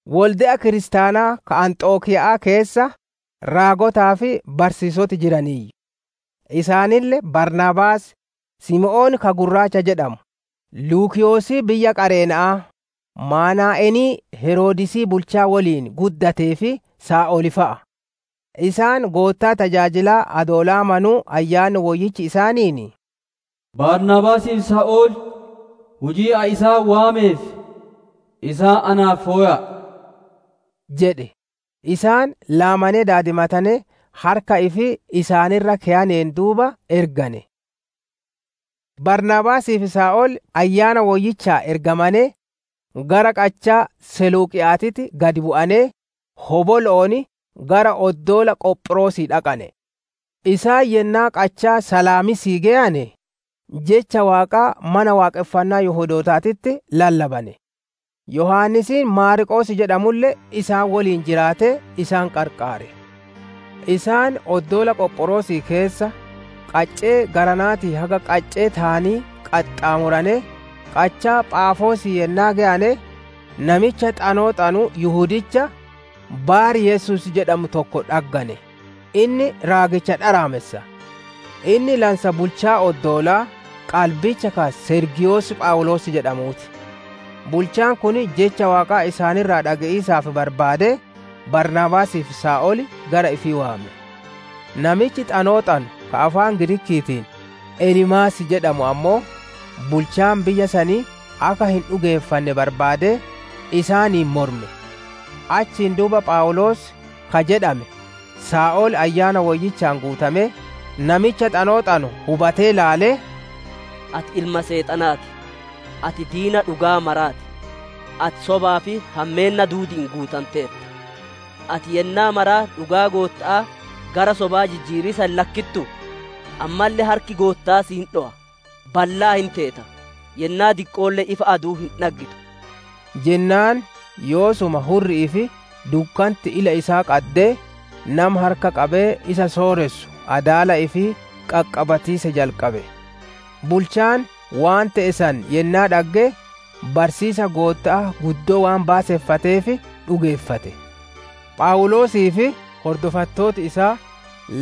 Wolde'a kiristaanaa ka Anxokiya'aa keessa raagotaa fi barsiisoti jiraniiyyu: isaanille Baarnaabaas, Simoon ka «Gurraacha» jedhamu, Luukiyoosii biyya Qareena'aa, Maanaa'enii Heroodisii bulchaa woliin guddatee fi Saa'ol fa'a. Isaan Goottaa tajaajilaa adoo laamanuu Ayyaanni Woyyichi isaaniin, «Baarnaabaasii fi Saa'ol hujii ani isaan waameef, isaan naaf fowa'a» jedhe. Isaan laamanee daadimatanee, harka ifii isaan irra keyaneen duuba ergane. Baarnaabaasii fi Saa'ol Ayyaana Woyyichaan ergamanee, gara qachaa seluuqiya'aatitti gad bu'anee, hobolo'oon gara oddoola Qophiroosii dhaqane. Isaan yennaa qachaa Salaamiisii geyane, Jecha Waaqaa mana waaqonfannaa Yihudootaatitti lallabane. Yohaannisiin Maarqoos jedhamulle isaan woliin jiraatee isaan qarqaare. Isaan oddoola Qophiroosii keessa qaccee garanaatii haga qaccee taanii qaxxaamuranee, qachaa Phaafoosii yennaa geyane, namicha xanoo xanu Yihudicha Baar-Yesuus jedhamu tokko dhaggane; inni raagicha dharaamessa. Inni lansa bulchaa oddoolaa qalbicha ka Sergiiyosii Phawuloos jedhamuu ti. Bulchaan kun Jecha Waaqaa isaan irraa dhage'iisaaf barbaadee, Baarnaabaasii fi Saa'ol gara ifii waame. Namichi xanoo xanu ka afaan Giriikiitiin «Eliimaas» jedhamu ammoo, bulchaan biyya sanii akka hin dhugeeffanne barbaadee, isaaniin morme. Achiin duuba Phawuloos ka jedhame Saa'ol Ayyaana Woyyichaan guutamee, namicha xanoo xanu hubatee ilaalee, «Ati ilma Seexanaa ti! Ati diina dhugaa maraa ti! Ati sobaa fi hammeenna duudi'iin guutanteerta; ati yennaa mara dhugaa Gootta'aa gara sobaa jijjiiriisa hin lakkittuu? Ammalle harki Gootta'aa si hin dhowa; ballaa hin teeta; yennaa diqqoolle ifa adu'uu hin dhaggitu» jennaan, Yoosuma hurri'ii fi dukkanti ila isaa qaddee, nama harka qabee isa sooressu adaala ifii qaqqabatiisa jalqabe. Bulchaan waan te'e san yennaa dhagge, barsiisiisa Gootta'aa guddoo waan baaseffateef dhugeeffate. Phawuloosii fi hordofattooti isaa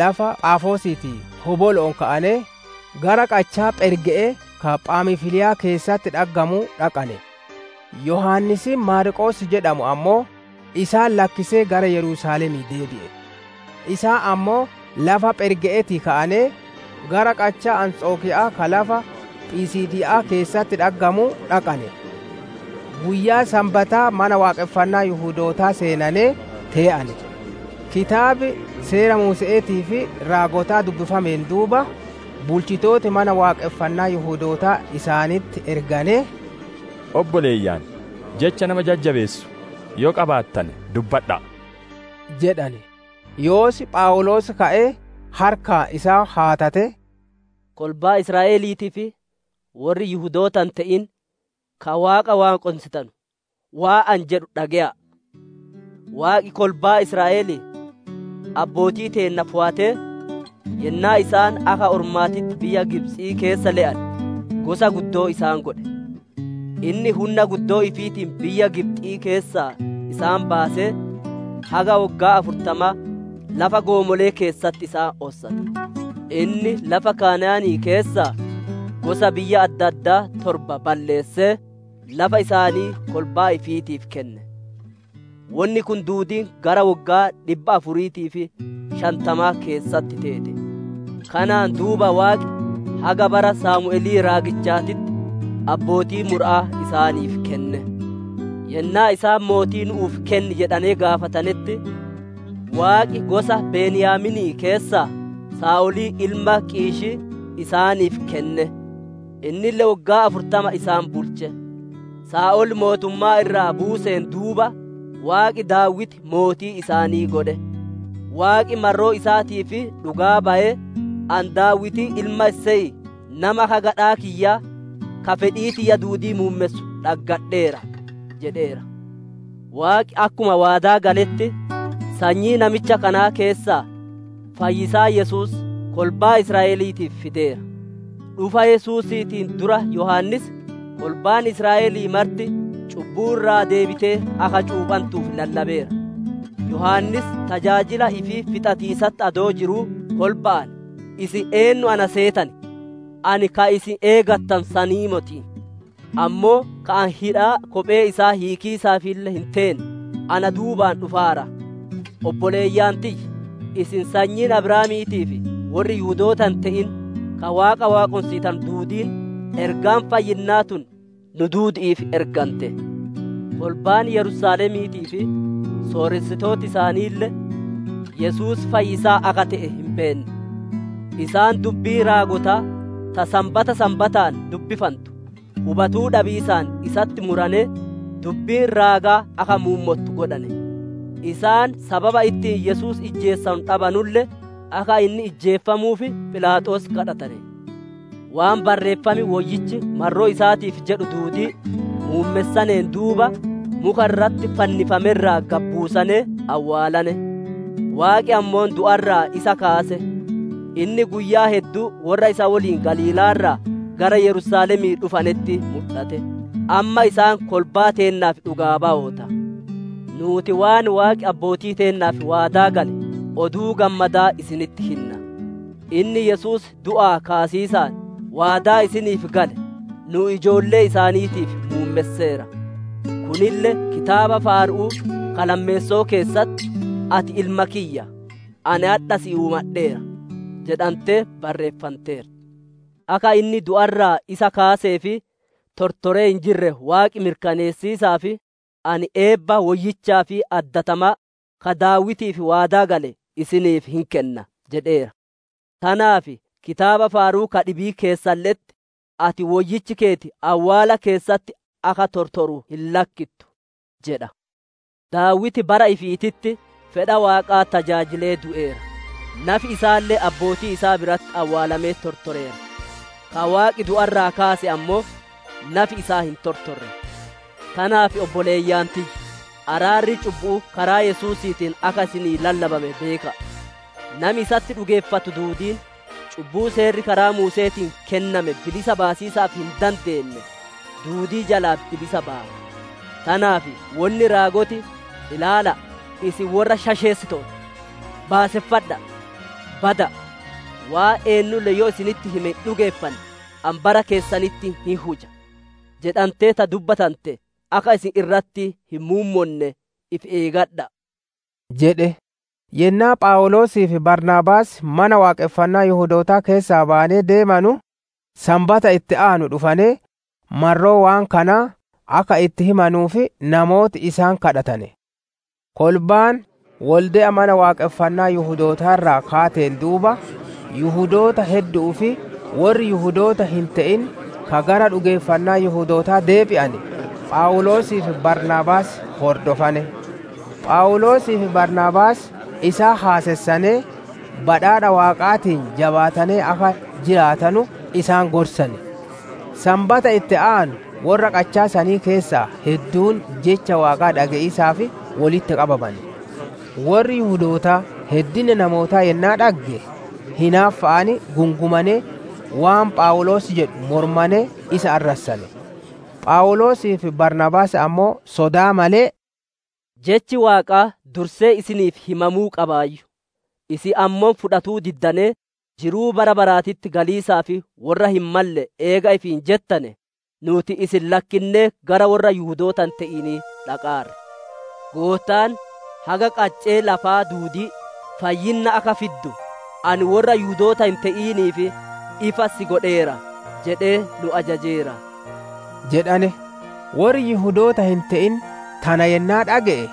lafa Phaafoosiitii hobolo'oon ka'anee, gara qachaa Pherge'ee ka Phamfiliyaa keessatti dhaggamuu dhaqane; Yohaannisiin Maarqoos jedhamu ammoo, isaan lakkisee gara Yerusaalemii deebi'e. Isaan ammoo lafa Pherge'eetii ka'anee, gara qachaa Anxokiya'aa ka lafa Phisiidiya'aa keessatti dhaggamuu dhaqane; guyyaa Sanbataa mana waaqonfannaa Yihudootaa seenanee tee'ane. Kitaab Seera Muuse'eetii fi Raagotaa dubbifameen duuba, bulchitooti Mana Waaqonfannaa Yihudootaa isaanitti erganee, «Obboleeyyan, jecha nama jajjabeessu yoo qabaattane dubbadha'a» jedhane. Yoos Phawuloos ka'ee harkaan isaan haatatee: «Kolbaa Israa'eliitii fi worri Yihudoota hin te'in ka Waaqa waaqonsitanu, waan ani jedhu dhage'a'a! Waaqi kolbaa Israa'elii, abbootii teenna fowatee, yennaa isaan akka ormaatitti biyya Gibxii keessa le'ane, gosa guddoo isaan godhe. Inni hunna guddoo ifiitiin biyya Gibxi'ii keessaa isaan baasee, haga woggaa afurtamaa lafa goomole'ee keessatti isaan ossate. Inni lafa Kana'aanii keessaa gosa biyya adda addaa torba balleessee, lafa isaanii kolbaa ifiitiif kenne. Wonni kun duudiin gara woggaa dhibba afurii fi shantamaa keessatti teete. «Kanaan duuba Waaqi haga bara Saamu'elii raagichaatitti abbootii mura'aa isaaniif kenne. Yennaa isaan mootii nu'uuf kenni jedhanee gaafatanetti, Waaqi gosa Beniyaaminii keessaa Saa'olii ilma Qiishii isaaniif kenne; innille woggaa afurtama isaan bulche. Saa'ol mootummaa irraa buuseen duuba, Waaqi Daawiti mootii isaanii godhe. Waaqi marroo isaatiif dhugaa bayee, ‹Ani, Daawitii ilma Iseyii nama akka gadhaa kiyyaa, ka fedhii tiyya duudii muummessu dhaggadheera› jedheera. Waaqi akkuma waadaa galetti, sanyii namicha kanaa keessaa fayyisaa Yesuus kolbaa Israa'eliitiif fideera. Dhufa Yesuusiitiin dura Yohaannis, kolbaan Israa'elii marti cubbuu irraa deebitee akka cuuphantuuf lallabeera. Yohaannis tajaajila ifii fixatiisatti adoo jiruu kolba'aan, ‹Isin eennu na seetan? Ani ka isin eegattanu sanii moti. Ammoo ka ani hidhaa kophee isaa hiikiisaafille hin teene, na duubaan dhufaara› jedheen. «Obboleeyyan tiyya, isin sanyiin Abrahaamiitii fi worri Yihudoota hin te'in ka Waaqa waaqonsitanu duudiin, ergaan fayyinnaa tun nu duudi'iif ergante. Kolbaan Yersaalemiitii fi sooressitooti isaaniille Yesuus fayyisaa akka te'e hin beenne; isaan dubbii raagotaa ta Sanbata Sanbataan dubbifantu hubatuu dhabiisaan isatti muranee, dubbiin raagaa akka muummottu godhane. Isaan sababa ittiin Yesuus ijjeesisanu dhabanulle, akka inni ijjeefamuuf Philaaxoos gaafatane. Waan Barreeffam Woyyichi marroo isaatiif jedhu duudii muummessaneen duuba, muka irratti fannifame irraa gad buusanee awwaalane. Waaqi ammoo du'a irraa isa kaase. Inni guyyaa hedduu worra isa woliin Galiilaa irraa gara Yerusaalemii dhufanetti mudhate. Amma isaan kolbaa teennaaf dhugaa bayoota. «Nuuti waan Waaqi abbootii teennaaf waadaa gale Oduu Gammadaa isinitti hinna. Inni Yesuus du'aa kaasiisaan waadaa isaaniif gale, nu'u ijoollee isaaniitiif muummesseera. Kunille kitaaba Faaru'uu ka lammeesso'oo keessatti, « ‹Ati Ilma kiyya; ani adha si uumadheera› jedhantee barreeffanteerti. Akka inni du'a irraa isa kaasee fi tortoree hin jirre Waaqi mirkaneessiisaaf, ‹Ani eebba woyyichaa fi addatamaa, ka Daawitiif waadaa gale isiniif hin kenna› jedheera. Tanaaf kitaaba Faaru'uu ka dhibii keessalle'etti, ‹Ati Woyyichi keeti awwaala keessatti akka tortoru hin lakkittu› jedha. Daawiti bara ifiititti fedha Waaqaa tajaajilee du'eera; nafi isaalle abbootii isaa biratti awwaalamee tortoreera. Ka Waaqi du'a keessaa kaase ammoo, nafi isaa hin tortorre. Tanaaf obboleeyyan tiyya, araarri cubbu'uu karaa Yesuusiitiin akka isinii lallabame beeka'a. Nami isatti dhugeeffatu duudiin, cubbuu seerri karaa Muuse'eetiin kenname bilisa baasiisaaf hin dandeenne duudii jalaa bilisa baya. Tanaaf wonni raagoti, « ‹Ilaala'a, isin worra shasheessitoota! Baaseffadha'a! Bada'a! Waan eennulle yoo isinitti hime hin dhugeeffanne, ani bara keessanitti hin huja› jedhantee ta dubbatante, akka isin irratti hin muummonne ifi eegadha'a» jedhe. Yennaa Phawuloosii fi Baarnaabaas Mana Waaqonfannaa Yihudootaa keessaa bayanee deemanu, Sanbata itti aanu dhufanee marroo waan kanaa akka itti himanuuf namooti isaan kadhatane. Kolbaan wolde'a Mana Waaqonfannaa Yihudootaa irraa kaateen duuba, Yihudoota heddu'uu fi worri Yihudoota hin te'in ka gara dhugeeffannaa Yihudootaa deebi'ane, Phawuloosii fi Baarnaabaas hordofane. Phawuloosii fi Baarnaabaas isaan haasessanee, badhaadha Waaqaatiin jabaatanee akka jiraatanu isaan gorsane. Sanbata itti aanu worra qachaa sanii keessaa hedduun Jecha Waaqaa dhage'iisaaf wolitti qabamane. Worri Yihudootaa heddummaa namootaa yennaa dhagge, hinaaffa'aan guutamanee, waan Phawuloos jedhu moromanee isa arrassane. Phawuloosii fi Baarnaabaas ammoo sodaa malee, «Jechi Waaqaa dursee isiniif himamuu qabaayyu; isin ammoo fudhatuu diddanee, jiruu bara baraatitti galiisaaf worra hin malle eega ifiin jettane, nuuti isin lakkinnee gara worra Yihudoota hin te'inii dhaqaarra. Goottaan, «‹Haga qaccee lafaa duudii fayyinna akka fiddu, Ani worra Yihudoota hin te'iniif ifa si godheera› jedhee nu ajajeera» jedhane. Worri Yihudoota hin te'in tana yennaa dhage'e,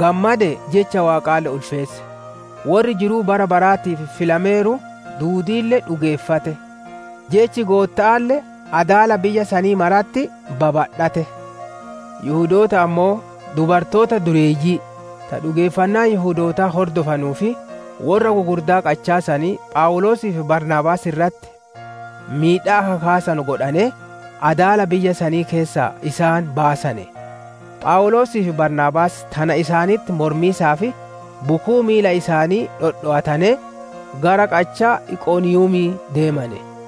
gammadee jecha Waaqaalle ulfeesse; worri jiruu bara baraatiif filameeru duudiille dhugeeffate. Jechi Gootta'aalle adaala biyya sanii maratti babadhatte. Yihudooti ammoo, dubartoota dureeyyii ta dhugeeffannaa Yihudootaa hordottuu fi worra gugurdaa qachaa sanii, Phawuloosii fi Baarnaabaas irratti miidhaa akka kaasanu godhanee, adaala biyya sanii keessaa isaan baasane. Phawuloosii fi Baarnaabaas tana isaanitti mormiisaaf bukuu miila isaanii dhodhowatanee, gara qachaa Iqoniiyumii deemane.